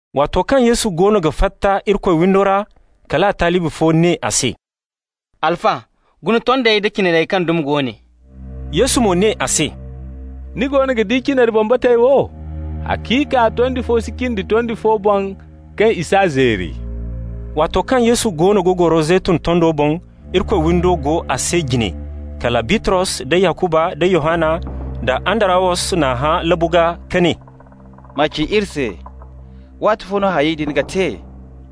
Waato kaŋ Yesu goono ga fatta Irikoy windo ra, kal a talibi fo ne a se: «Alfa, guna tondey da cinarey kaŋ dumi go ne.» Yesu mo ne a se: «Ni goono ga di cinari bambatey wo? Haciika, tondi fo si cindi tondi fo boŋ kaŋ i s'a zeeri.» Waato kaŋ Yesu goono ga goro Zeytun tondo boŋ, Irikoy windo go a se jine, kala Bitros da Yakuba nda Yohanna da Andarawos n'a hã labu gaa ka ne: «Ma ci iri se, waatifo no hayey din ga te?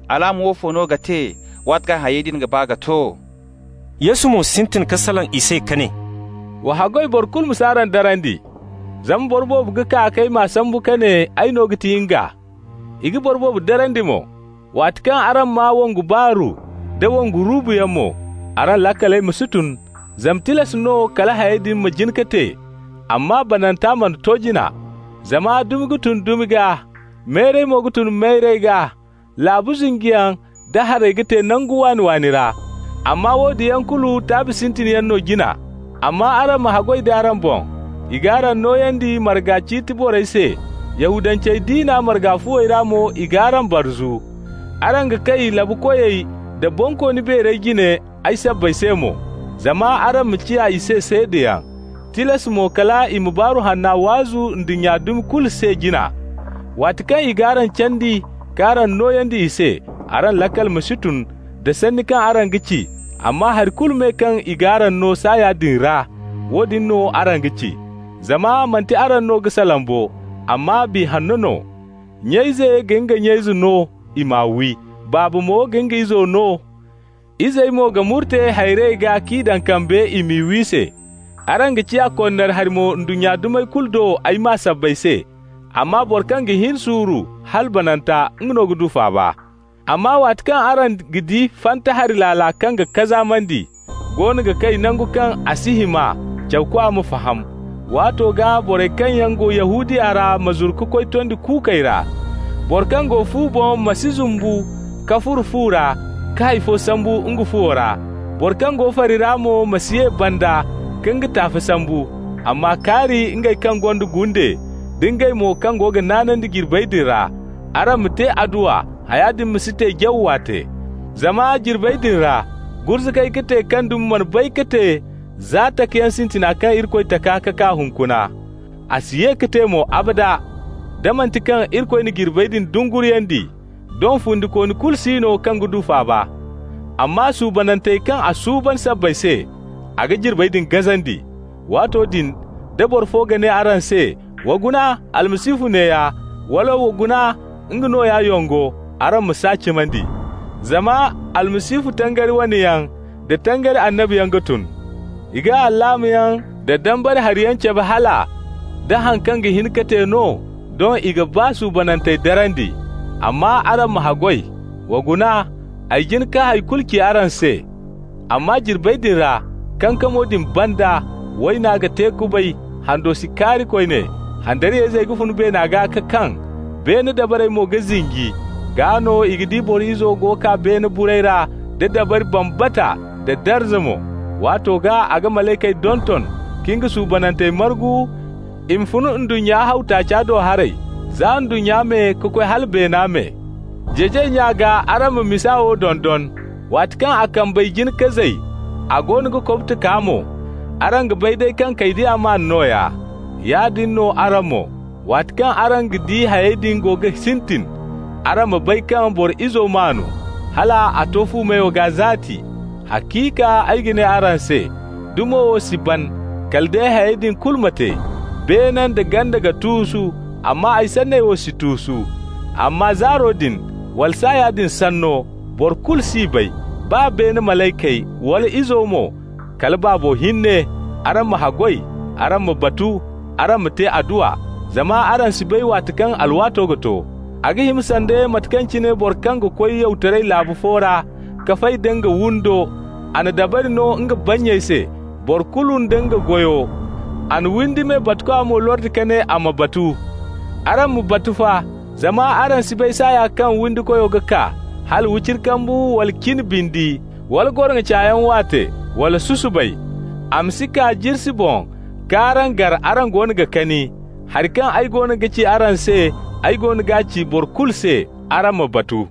Alaama woofo no ga te waati kaŋ hayey din ga ba ka to?» Yesu mo sintin ka salaŋ i se ka ne: «Wa haggoy boro kulu ma si araŋ darandi. Zama boro boobo ga kaa k'ay ma sambu ka ne: ‹Ay no ga ti nga.› I ga boro boobo darandi mo. Waati kaŋ araŋ maa wongu baaru nda wongu ruubuyaŋ mo, araŋ laakaley ma si tun, zama tilas no kala hayey din ma jin ka te, amma bananta mana to jina. Zama dumi ga tun dumi gaa, mayray mo ga tun mayray gaa, laabu zinjiyaŋ da haray ga te nangu waani-waani ra. Amma woodin yaŋ kulu taabi sintin yaŋ no jina. Amma araŋ ma haggoy da araŋ boŋ. I g'araŋ nooyandi marga ciiti borey se, Yahudance diina marga fuwey ra mo i g'araŋ barzu. Araŋ ga kay laabu koyey da bonkooni beerey jine ay sabbay se mo, zama araŋ ma ciya i se seedayaŋ. Tilas mo kal i ma Baaru Hanna waazu ndunnya dumi kulu se jina. Waati kaŋ i g'araŋ candi k'araŋ nooyandi i se, araŋ laakal ma si tun da sanni kaŋ araŋ ga ci, amma hari kulu me kaŋ i g'araŋ no saaya din ra, woodin no araŋ ga ci. Zama manti araŋ no ga salaŋ bo, amma Biya Hanno no. Nya ize ga nga nya izo no i m'a wi, baaba mo ga nga izo no. Izey mo ga murte hayrey gaa k'i daŋ kambe i m'i wi se. Araŋ ga ciya konnari hari mo ndunnya dumey kulu do ay maa sabbay se, amma boro kaŋ ga hin suuru hala bananta, nga no ga du faaba. Amma waati kaŋ araŋ ga di ‹fanta hari laala kaŋ ga kazaamandi,› goono ga kay nangu kaŋ a si hima (cawkwa ma faham), waato gaa borey kaŋ yaŋ go Yahudiya ra ma zuru ka koy tondi kuukey ra. Boro kaŋ go fu boŋ ma si zumbu ka furo fu ra ka hay fo sambu nga fuwo ra. Boro kaŋ go fari ra mo ma si ye banda ka nga taafe sambu. Amma kaari ngey kaŋ gonda gunde, da ngey mo kaŋ go ga naanandi jirbey din ra! Araŋ ma te adduwa haya din ma si te jaw waate ra. Zama jirbey din ra gurzugay ga te kaŋ dumi mana bay ka te za takayaŋ sintina kaŋ Irikoy taka ka kaa hunkuna. A si ye ka te mo, abada. Da manti kaŋ Irikoy na jirbey din dunguriyandi, doŋ fundikooni kulu si no kaŋ ga du faaba. Amma suubanantey kaŋ a suuban sabbay se, a ga jirbey din gazandi. Waato din da boro fo ga ne araŋ se: ‹Wa guna, Almasihu neeya!› wala: ‹Wa guna nga nooya yongo!› araŋ ma s'a cimandi. Zama almasihu, tangari wane yaŋ, da tangari annabiyaŋ ga tun. I ga alaamayaŋ da dambara hariyaŋ cabe hala, nda haŋ kaŋ ga hin ka te no, doŋ i ga baa suubanantey darandi. Amma araŋ ma haggoy. Wa guna, ay jin ka hay kulu ci araŋ se. Amma jirbey din ra, kankamo din banda, ‹Wayna ga te kubay, hando si kaari koyne, handariyayzey ga fun beena gaa ka kaŋ, beene dabarey mo ga zinji.› Gaa no i ga di Boro Izo go kaa beene burey ra da dabari bambata nda darza mo. Waato gaa a ga malaykey donton ka nga suubanantey margu i ma fun ndunnya haw taaca do haray, za ndunnya me ka koy hala beena me. Jeejay nya gaa araŋ ma misa wo dondon. Waati kaŋ a kambey jin ka zay, a goono ga kobto kaa mo, araŋ ga bay day kaŋ kaydiya maan nooya. Yaadin no araŋ mo, waati kaŋ araŋ ga di hayey din go ga sintin, araŋ ma bay kaŋ Boro Izo maanu, hala a to fu meyo gaa zaati. Haciika ay ga ne araŋ se, dumo wo si ban, kala day hayey din kulu ma te. Beene da ganda ga tuusu, amma ay sanney wo si tuusu. Amma zaaro din, wala saaya din sanno, boro kulu s'i bay, baa beene malaykey, wala Izo mo, kala Baabo hinne. Araŋ ma haggoy, araŋ ma batu, araŋ ma te adduwa, zama araŋ si bay waati kaŋ alwaato ga to. A ga hima sanda mate kaŋ cine boro kaŋ ga koy yawtaray laabu fo ra ka fay da nga windo, a na dabari no nga bannyey se, boro kulu nda nga goyo. A na windi me batukwa mo lordi ka ne a ma batu. Araŋ ma batu fa, zama araŋ si bay saaya kaŋ windikoyo ga kaa, hala wiciri kambu wala cin bindi, wala goroŋo cayaŋ waate, wala susubay. A ma si kaa jirsi boŋ ka araŋ gar araŋ goono ga kani. Hari kaŋ ay goono ga ci araŋ se, ay goono g'a ci boro kulu se: araŋ ma batu!»